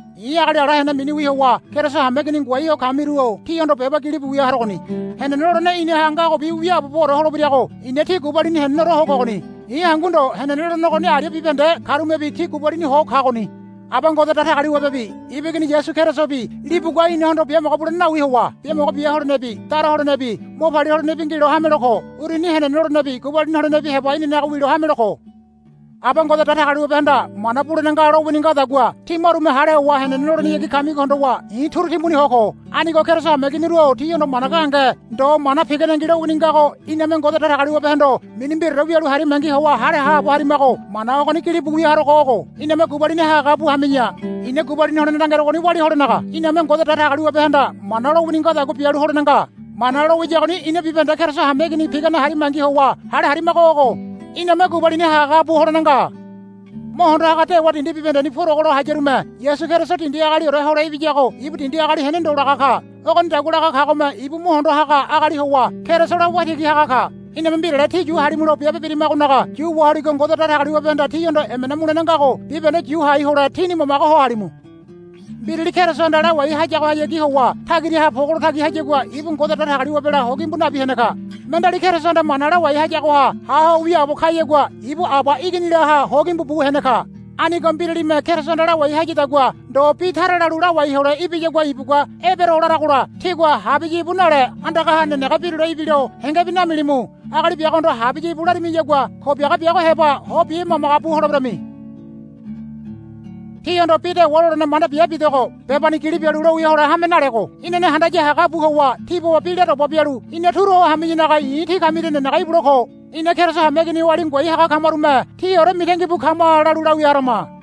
I̱ agali ala hene miniwi howa Keriso hameigini ngoai ho kamiru-o tíhondo beba gilibu wia harogoni. Henene lolene inaha ngagobi wiaaboore holebirago i̱na tí gubalini heneneore ho kogoni. I̱ hangu ndo henene lolene ogoni aria bibahende karumebi tí gubalini ho kagoni. Aba Ngode Datagaliwabebi ibu Igini Yasu Kerisobi libugua inahondo biamogo bulene nawi howa biamogo bia holenebi dara holenebi mo palia holenebi ngilo hamelo ko. Uruni henene lolenebi gubalini holenebi heba inanaga wilo hamelo ko. Aba Ngode Datagaliwabehanda mana bulene nga lowini ngadagua tí marume hale howa henene lolenehayagi kamigo hondowa i̱ turu timbuni ho ko. Anigo Keriso hameiginiru-o tíhondo mana gahenge ndo mana piganengi lowini ngago iname Ngode Datagaliwabehondo mini mbiraore wialu harimangi howa hale haabo harimago mana ogoni gilibu wia harogo ogo. Iname gubalini hagahaga bu hami̱ya. I̱na gubalini holene langerogoni walia holenaga iname Ngode Datagaliwabehanda mana lowini ngadagua bialu holene nga. Mana lowiyagoni ina bibahende Keriso hameigini pigane harimangi howa hale harimago ogo. Iname gubalini hagahaga bu holene nga. Mo hondo haga dewa dindi bibahendeni purogolo hayarume Yasu Keriso dindi agaliore hole ibiyago ibu dindi agali hene ndo laga ka. Ogonidagua laga kagome ibu mo hondo haga agali howa Kerisola Waitigi haga ka. Iname mbirale tí yu halimulo biabe birimagonaga yu waholigo Ngode Datagaliwabehanda tíhondo emena mulene ngago bibahende yu hai hole tíni mamage ho halimu. Mbirali Kerisohanda lawai hayagohayagi howa tagiraha pogolo tagi hayagua ibu Ngode Datagaliwabela hogimbu nabi hene ka. Mendeali Kerisohanda mana lawai hayagoha ha ho wiaabo kayagua ibu Aba Iginilaha hogimbu bu hene ka. Anigo mbiralime Kerisohanda lawai hayadagua ndo bi tara lalu lawai hole ibiyagua ibugua, Ebero, laragola, tígua, Habiya íbu, nale andagaha nenege birule ibilo hengebi namilimu. Agali biagohondo, Habiya íbu, larimiyagua ko biaga biago heba ho bimagamaga bu holeberami. Tíhondo bi dewa lolene manda bia bidogo bebani gili bialu lowia hole hame nalego inane handaya hagabu howa tí baba bi la doba bialu ina turu ho hami̱yanaga i̱ tí kamiria nenege ibule ko. Ina Keriso hameigini oali ngoai haga kamarume, Tíore mitangi bu kama, lalu lawia harama.